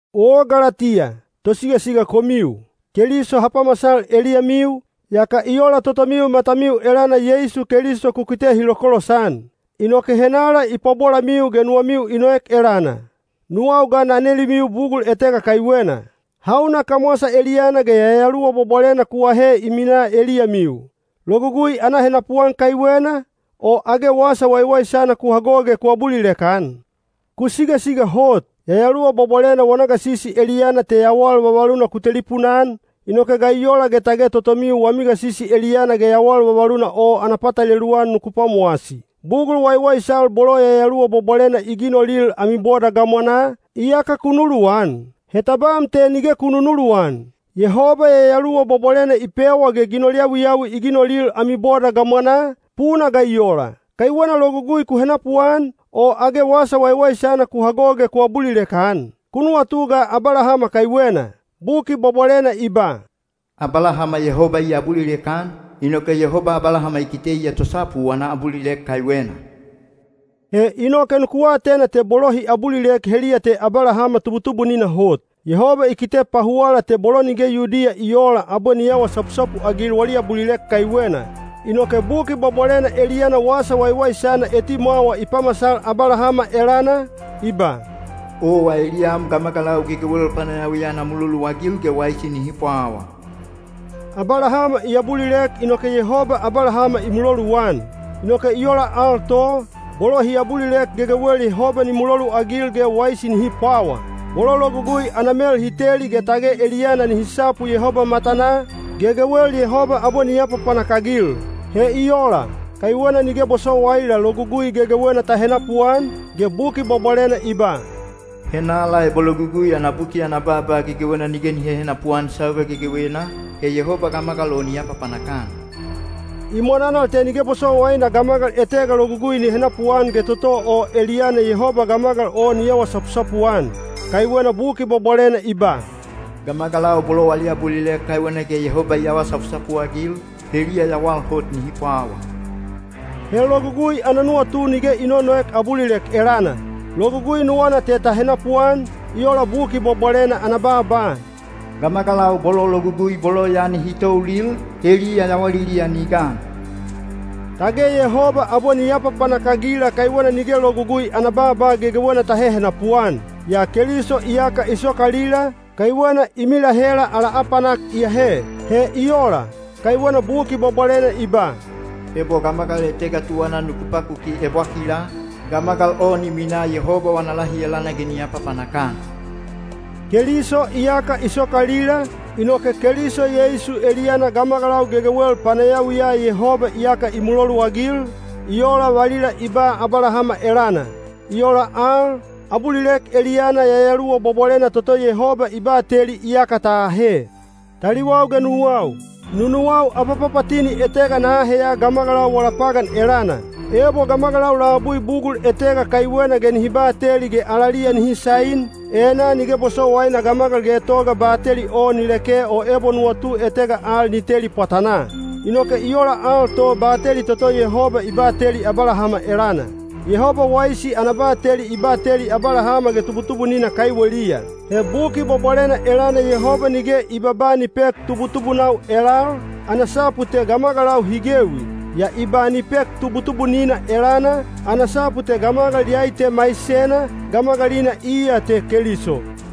O Galatiya, tosigasiga komiu! Keliso ha pamasal eliyamiu, yaka i ola totomiu matamiu elana Yeisu Keliso ku kite hi lokolosan. Inoke henala i pabolamiu ge nuwamiu i noek elana? Nuwau ga na nelimiu bugul etega kaiwena: hauna kamwasa eliyana ge Yayaluwa Bwabwalena ku ahe i minaa eliyamiu? Logugui ana henapuan kaiwena, o age wasa waiwaisana ku hago ge ku abulilek-an? Ku sigasiga hot! Yayaluwa Bwabwalena wana gasisi eliyana te yawal vavaluna ku telipuna-an, inoke ga i ola ge tage totomiu wami gasisi eliyana ge yawal vavaluna o ana patalelu-an nuku pwamowasi? Bugul waiwaisal bolo Yayaluwa Bwabwalena i ginolil ami boda gamwanaa, iyaka ku nuluwan? He tabam te nige ku nunuluwan! Yehoba Yayaluwa Bwabwalena i pewa ge ginol yawiyawi i ginolil ami boda gamwanaa, puna ga i ola? Kaiwena logugui ku henapuan, o age wasa waiwaisana ku hago ge ku abulilek-an? Ku nuwatu ga Abalahama kaiwena. Buki Bwabwalena i ba, “Abalahama Yehoba i abulilek-an, inoke Yehoba Abalahama i kite iya tosapu wana abulilek kaiwena.” He inoke nuku atena te bolo hi abulilek heliya te Abalahama tubutubunina hot. Yehoba i kite pahuwala te bolo nige Yudiya i oola abwe ni awa sapusapu-agil wali abulilek kaiwena. Inoke Buki Bwabwalena eliyana Wasa Waiwaisana etimwawa i pamasal Abalahama elana, i ba, “Owa eliyam gamagalau gegewel panayawiya na muloluagil ge waisi nihi pwawa.” Abalahama i abulilek inoke Yehoba Abalahama i muloluan. Inoke i ola al to, bolo hi abulilek gegewel Yehoba ni muloluagil ge waisi nihi pwawa. Bolo logugui ana mel hi teli ge tage eliyana nihi sapu Yehoba matanaa, gegewel Yehoba abwe ni apapanak-agil. He i ola, kaiwena nige bosowaila Logugui gegewena ta henapuan, ge Buki Bwabwalena i ba, “Henala ebo Logugui ana buki ana baaba gegewena nige ni hehenapu-an sauga gegewena, he Yehoba gamagal o ni apapanak-an.” I mwananal te nige bosowaina gamagal etega logugui ni henapuan ge toto o eliyana Yehoba gamagal o ni awa sapusapu-an. Kaiwena Buki Bwabwalena i ba, “Gamagalau bolo wali abulilek kaiwena ge Yehoba i awa sapusapu-agil, heliya yawal hot nihi pwawa.” He logugui ana nuwatu nige i nonoek abulilek elana. Logugui nuwana te ta henapuan, i ola Buki Bwabwalena ana baaba, “Gamagalau bolo logugui bolo ya nihi toulil, heliya yawaliliya ni gan.” Tage Yehoba abwe ni apapanak-agila kaiwena nige logugui ana baaba gegewena ta hehenapu-an. Yaa Keliso iyaka i sokalila, kaiwena i milahela ala apanak i ahe. He i ola, kaiwena Buki Bwabwalena i ba, “Ebo gamagal etega tuwana nuku pakuki ebwakila, gamagal o ni minaa Yehoba wana lahi elana ge ni apapanak-an.” Keliso iyaka i sokalila, inoke Keliso Yeisu eliyana gamagalau gegewel panayawiya Yehoba iyaka i muloluagil, i ola valila i ba Abalahama elana. I ola al, abulilek eliyana Yayaluwa Bwabwalena toto Yehoba i bateli iyaka ta ahe. Taliwau ge nuwau, nunuwau abapapatini etega na aheya gamagalau wala pagan elana. Ebo gamagalau labui bugul etega kaiwena ge nihi bateli ge alaliya nihi sain, enaa nige bosowaina gamagal getoga bateli o ni leke o ebo nuwatu etega al ni teli pwatanaa. Inoke i ola al to bateli toto Yehoba i bateli Abalahama elana. Yehoba waisi ana bateli i bateli Abalahama ge tubutubunina kaiweliya. (He Buki Bwabwalena elana Yehoba nige i babaa ni pek “tubutubunau” elal, ana sapu te gamagalau hi gewi. Yaa i ba ni pek “tubutubunina” elana, ana sapu te gamagal iyai te maisena, gamagalina iya te Keliso.)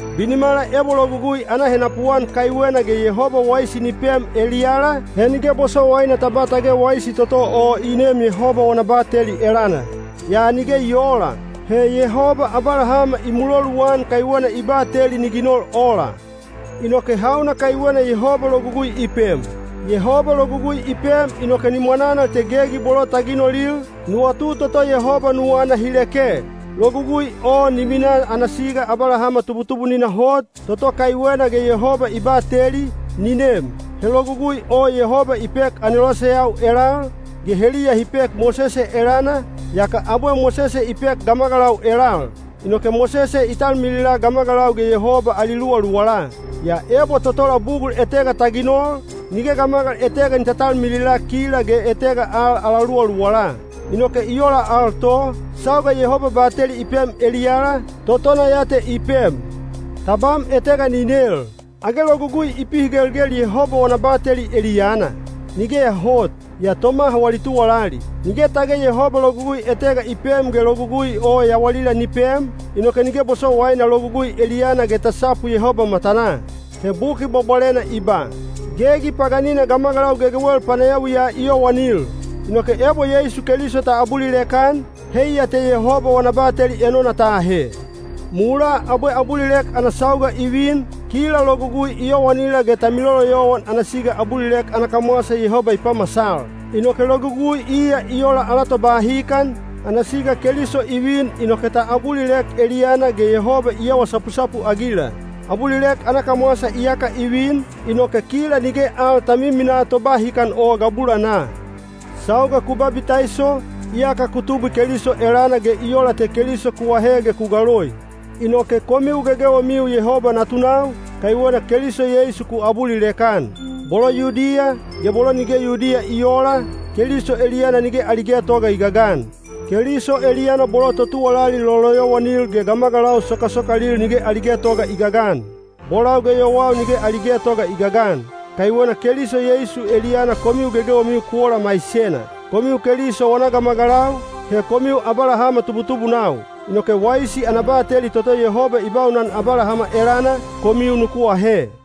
Binimala ebo logugui ana henapuan kaiwena ge Yehoba waisi ni pem eliyala, he nige bosowaina ta ba tage waisi toto o i neem Yehoba wana bateli elana. Yaa nige i oola. He Yehoba Abalahama i muloluan kaiwena i bateli ni ginol ola. Inoke hauna kaiwena Yehoba logugui i pem? Yehoba logugui i pem inoke ni mwananal te gegi bolo ta ginolil, nuwatu toto Yehoba nuwana hi leke. Logugui o ni mina ana siga Abalahama tubutubunina hot, toto kaiwena ge Yehoba i bateli, ni nem. (He Logugui o Yehoba i pek aneloseyau elal, ge heliya hi pek Mosese elana, yaka abwe Mosese i pek gamagalau elal. Inoke Mosese i talmilila gamagalau ge Yehoba ali luwaluwala. Yaa ebo totola bugul etega ta ginol, nige gamagal etega ni taltalmilila kila ge etega al ala luwaluwala. Inoke i ola al to, sauga Yehoba bateli i pem eliyala, totona ya te i pem.) Tabam etega ni nel, “Age Logugui i pihigelgel Yehoba wana bateli eliyana?” Nigeya hot, yaa tomaha wali tuwalali. Nige tage Yehoba logugui etega i pem ge logugui o yawalila ni pem, inoke nige bosowaina logugui eliyana ge ta sapu Yehoba matanaa. He Buki Bwabwalena i ba, “Gegi paganina gamagalau gegewel panayawiya i yowanil.” Inoke ebo Yeisu Keliso ta abulilek-an, heiya te Yehoba wana bateli enona ta ahe. Mulaa abwe abulilek ana sauga i vin, kila logugui i yowanila ge ta miloloyowan ana siga abulilek ana kamwasa Yehoba i pamasal. Inoke logugui iya i ola ala tobahikan, ana siga Keliso i vin inoke ta abulilek eliyana ge Yehoba i awa sapusapu-agila. Abulilek ana kamwasa iyaka i vin, inoke kila nige al ta miminaa tobahikan o gabulanaa. Sauga ku babitaiso, iyaka ku tubwi Keliso elana ge i ola te Keliso ku ahe ge ku galoi. Inoke komiu gegewemiu Yehoba natunau, kaiwena Keliso Yeisu ku abulilek-an. Bolo Yudiya, ge bolo nige Yudiya i oola, Keliso eliyana nige ali getoga i gagan. Keliso eliyana bolo totuwalali loloyowanil ge gamagalau sokasokalil nige ali getoga i gagan; bolau ge yowau nige ali getoga i gagan. Kaiwena Keliso Yeisu eliyana komiu gegewemiu ku ola maisena. Komiu Keliso wana gamagalau, he komiu Abalahama tubutubunau. Inoke waisi ana bateli toto Yehoba i baunan Abalahama elana, komiu nuku ahe.